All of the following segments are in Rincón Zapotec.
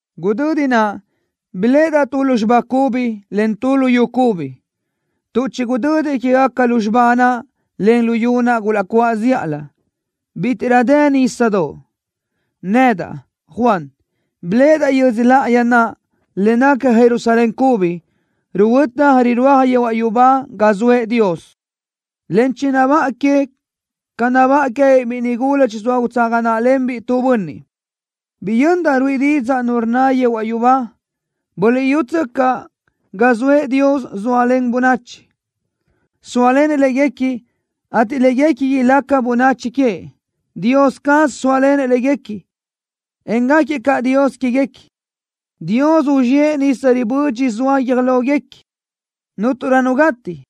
Gudödi naʼ biléʼedaʼ tu lúzxiba cubi, en tu luyú cubi, tuʼ chigudödi quégaca lúzxiba naʼ, en luyú naʼ gulaʼcuáʼ zíʼalö. Bítiʼrö dë nísadoʼ. Nedaʼ, Juan, biléʼedaʼ yödzö láʼayi naʼ, le naca Jerusalén cubi, ruhuötaj, rirúaj yehuaʼ yubá ga zoëʼ Dios, en chinabáʼa que ca nabáʼa queë́biʼ biʼi nigula chizóa utsaga náʼalenbiʼ tu bönniʼ. Biyöndaʼ ruíʼi didzaʼ nu rnna yehuaʼ yubá: “¡Buliʼyútsöcaʼ! ¡Ga zoëʼ Dios zóalen bönachi! ¡Sóalenëʼ léguequi, ateʼ léguequi ilácagaca bönachi queëʼ! ¡Dios caz sóalenëʼ léguequi, en gáquiëʼ Dios quéguequi! Dios uzxíëʼ nisa ribödxi zoa guiö́j lóguequi. Cúnturö nu gati,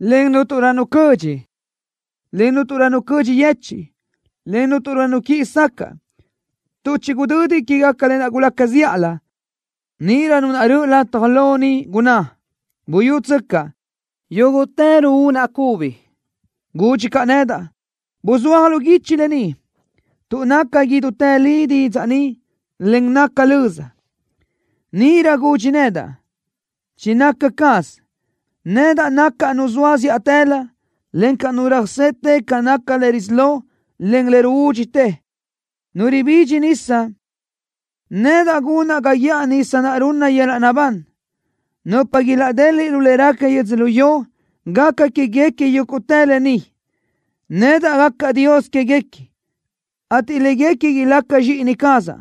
en cúnturö nu cödxi, en cúnturö nu cödxi yechiʼ, en cúnturö nu quiʼi sacaʼ, tuʼ chigudödi quégaca lë naʼ gulaca zíʼalö.” Níʼirö Nu naʼ röʼö lataj lo niʼ gunná: “¡Buyútsöcaʼ! ¡Yúguʼtë ruúnaʼ cubi!” Gudxi caʼ nedaʼ: “¡Buzúaj lu guichi lë ni, tuʼ naca idútë li didzaʼ ni, en naca löza!” Níʼirö gudxi nedaʼ: “¡Chinaca caz! ¡Nedaʼ nacaʼ Nu zoa zíʼatëlö, encaʼ Nu röjsete ca naca le risí lo, en le ruúdxitë! ¡Nu ribidxi nisa, nedaʼ gunaʼ ga guíʼaj nisa naʼ runna yöl-laʼ naʼbán! Nupa ilaʼdeliʼ lu le raca yödzölió, gaca quéguequi yúguʼtë lë ni. Nedaʼ gacaʼ Dios quéguequi, ateʼ léguequi ilácagaca zxíʼini cazaʼ,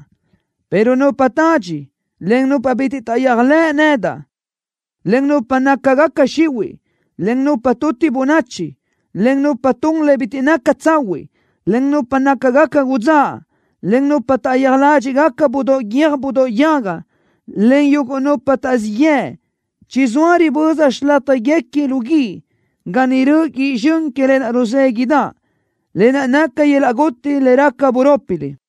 pero nupa tadxi, en nupa bitiʼ taʼyéajlëʼ nedaʼ, en nupa nácagaca xihuiʼ, en nupa tuti bönachi, en nupa tun le bitiʼ naca tsahuiʼ, en nupa nácagaca udzáʼ, en nupa taʼyéaj ládxiʼgaca budóʼ guiö́j budóʼ yaga, en yúguʼtë nupa taʼzíʼ yëʼ, chizóa riböza xilátjaguequi lu guíʼ, ga niʼ röʼö guíʼ zxön que lë naʼ ruzéguiʼdaʼ, lë naʼ naca yöl-laʼ guti le raca burópilö.”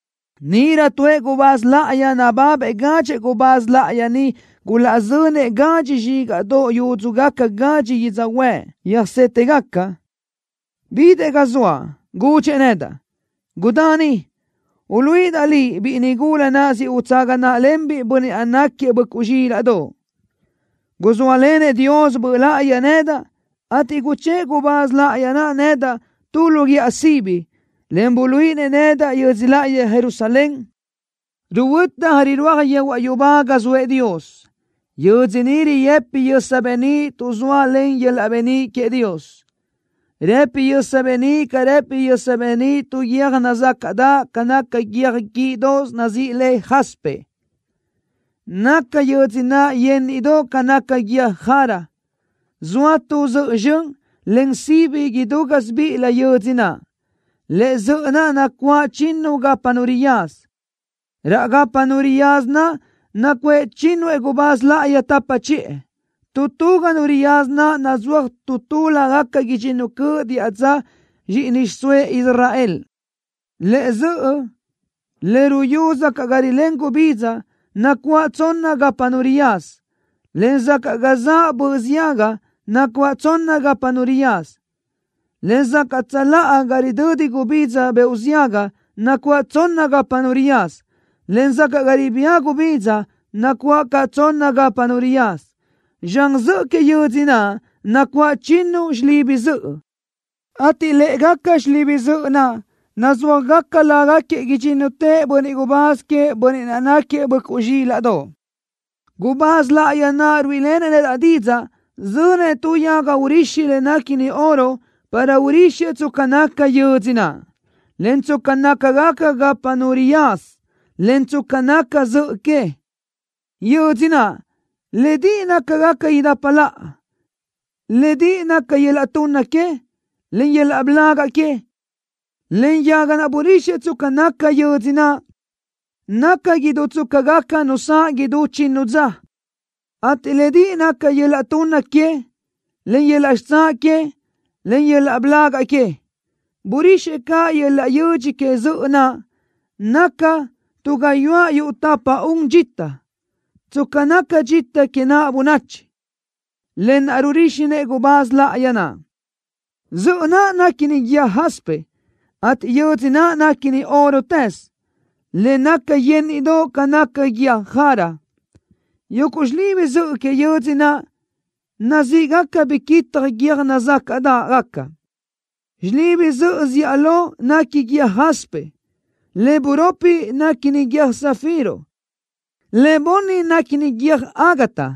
Níʼirö tuëʼ gubáz láʼayi nababëʼ gadxëʼ gubáz láʼayi niʼ gulaʼzönëʼ gadxi zxígaʼdoʼ yúdxugaca gadxi yödzöhuë́ʼ yöjsétegaca, bidëʼ ga zoaʼ. Gudxëʼ nedaʼ: “¡Gudá ni! ¡Uluíʼidaʼ liʼ biʼi nigula naʼ siʼ utsaga náʼalenbiʼ Bönniʼ naʼ náquiëʼ Böʼcuʼ Zxílaʼdoʼ!” Guzóalenëʼ Dios Böʼ Láʼayi nedaʼ, ateʼ guchë́ʼë gubáz láʼayi naʼ nedaʼ tu lu guíʼa sibi, en buluíʼinëʼ nedaʼ yödzö láʼayi Jerusalén, ruhuötaj, rirúaj yehuaʼ yubá ga zoëʼ Dios. Yödzö ni rëpi yösa beníʼ tuʼ zóalen le yöl-laʼ beníʼ queëʼ Dios. Rëpi yösa beníʼ ca rëpi yösa beníʼ tu guiö́j nazácaʼdaʼ ca naca guiö́j guíʼdoʼos nazíʼi le jaspe. Naca yödzö naʼ yeníʼidoʼ ca naca guiö́j jara. Zoa tu zöʼö zxön, en sibi idú gásibiʼilö yödzö naʼ. Lëʼe zöʼö naʼ nacuáʼ chinnu gapa nu riyaza. Raʼ gapa nu riyaza naʼ nacuʼë chínnuëʼ gubáz láʼayi tapa chiʼë. Tu tu ga nu riyaza naʼ nazúaj tu tu lágaca idxinnu cöʼ diʼa dza zxíʼini xiʼsóëʼ Israel. Lëʼe zöʼö le ruyú sacaʼ ga rilén gubidza nacuáʼ tsonna gapa nu riyaza, en sacaʼ ga zaʼ böʼ ziaga nacuáʼ tsonna gapa nu riyaza, en sacaʼ tsöláʼa ga ridödi gubidza beoʼ ziaga nacuáʼ tsonna gapa nu riyaza, en sacaʼ ga ribía gubidza nacuáʼ caʼ tsonna gapa nu riyaza. Zxan zöʼö que yödzö naʼ nacuáʼ chinnu xilibi zöʼö, ateʼ lë́ʼegaca xilibi zöʼö naʼ nazúajgaca lágaquiëʼ idxínnutëʼ bönniʼ gubáz queëʼ Bönniʼ naʼ náquiëʼ Böʼcuʼ Zxílaʼdoʼ. Gubáz láʼayi naʼ ruíʼilenëʼ nedaʼ didzaʼ zönëʼ tu yaga urixi le néquini oro para urixëʼ tsca naca yödzö naʼ, en tsca nácagaca gapa nu riyaza, en tsca naca zöʼö que. Yödzö naʼ, lédiʼi nácagaca idapa laʼa. Lédiʼi naca yöl-laʼ tunna que, en yöl-laʼ blagaʼ que. Len yaga naʼ burixëʼ tsca naca yödzö naʼ, naca idú tsca gaca nu saʼ idú chinnu dza, ateʼ lédiʼi naca yöl-laʼ tunna que, en yöl-laʼ xitsáʼ que, en yöl-laʼ bölágaʼ que. Burixëʼ caʼ yöl-laʼ yödx que zöʼö naʼ, naca tu gayuáʼ yuʼ tapa-un dxita, tsca naca dxita que naʼ bönachi, lë naʼ ruríxinëʼ gubáz láʼayi naʼ. Zöʼö naʼ néquini guiö́j jaspe, ateʼ yödzö naʼ néquini órotëz, le naca yeníʼidoʼ ca naca guiö́j jara. Yuguʼ xilibi zöʼö que yödzö naʼ nazíʼgaca biquitaj guiö́j nazácaʼdaʼgaca. Xilibi zöʼö zíʼalö néquini guiö́j jaspe. Le buropi néquini guiö́j zafiro. Le bunni néquini guiö́j ágata.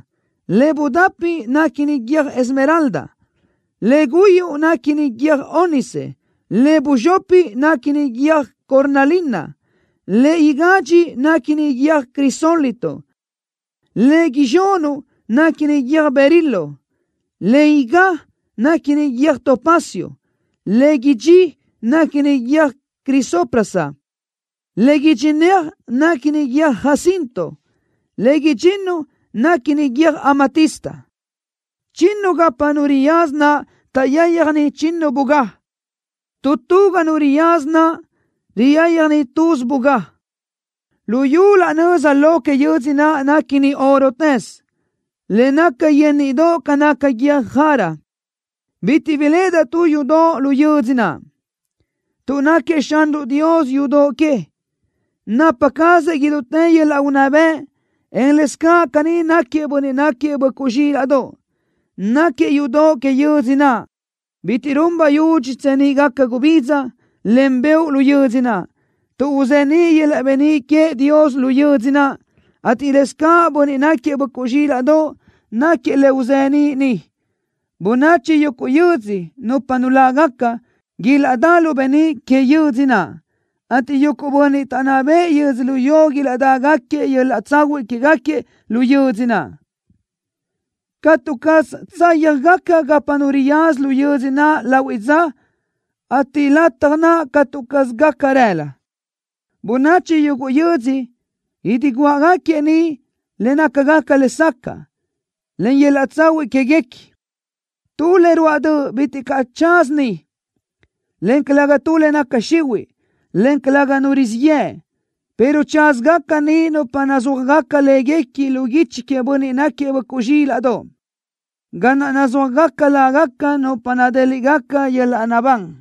Le budapi néquini guiö́j esmeralda. Le guyuʼ néquini guiö́j ónice. Le buzxopi néquini guiö́j cornalina. Le igadxi néquini guiö́j crisólito. Le izxunuʼ néquini guiö́j berilo. Le igá néquini guiö́j topacio. Le idxí néquini guiö́j crisoprasa. Le idxinéaj néquini guiö́j jacinto. Le idxinnu néquini guiö́j amatista. Chinnu gapa nu riyaza naʼ taʼyáyjani chinnu bugá. Tu tu ga nu riyaza naʼ riyáyjani tuz bugá. Luyú laʼ nöza lo que yödzö naʼ néquini órotëz, le naca yeníʼidoʼ ca naca guiö́j jara. Bitiʼ biléʼedaʼ tu yudoʼ lu yödzö naʼ, tuʼ náquiëʼ Xanruʼ Dios yudoʼ que, napa cazëʼ idútë yöl-laʼ unná bëʼ, en lëscaʼ caní náquiëʼ Bönniʼ náquiëʼ Böʼcuʼ Zxílaʼdoʼ, náquiëʼ yudoʼ que yödzö naʼ. Bitiʼ run bayudxi tseníʼgaca gubidza, en beoʼ lu yödzö naʼ, tuʼ uzeníʼ yöl-laʼ beníʼ queëʼ Dios lu yödzö naʼ, ateʼ lëscaʼ Bönniʼ náquiëʼ Böʼcuʼ Zxílaʼdoʼ náquiëʼ le uzeníʼ niʼ. Bönachi yuguʼ yödzö, nupa nulágaca, ilaʼdá lu beníʼ que yödzö naʼ, ateʼ yuguʼ bönniʼ taʼnná bëʼë yödzölió idiguáʼagaquiëʼ yöl-laʼ tsahuiʼ quégaquiëʼ lu yödzö naʼ. Catu caz tsáyajgaca gapa nu riyaza lu yödzö naʼ lahuiʼ dza, ateʼ lataj naʼ catu caz gaca rëla. Bönachi yuguʼ yödzö idiguáʼagaquiëʼ niʼ le nácagaca lesacaʼ, en yöl-laʼ tsahuiʼ quéguequi. Tu le ruáʼ döʼ bitiʼ caʼ tsaza niʼ, en calëga tu le naca xihuiʼ, en calëga nu rizíʼ yëʼ, pero tsázagacasö niʼ nupa nazúajgaca láguequi lu guichi queëʼ Bönniʼ náquiëʼ Böʼcuʼ Zxílaʼdoʼ, ga naʼ nazúajgaca lágaca nupa nadéliʼgaca yöl-laʼ naʼbán.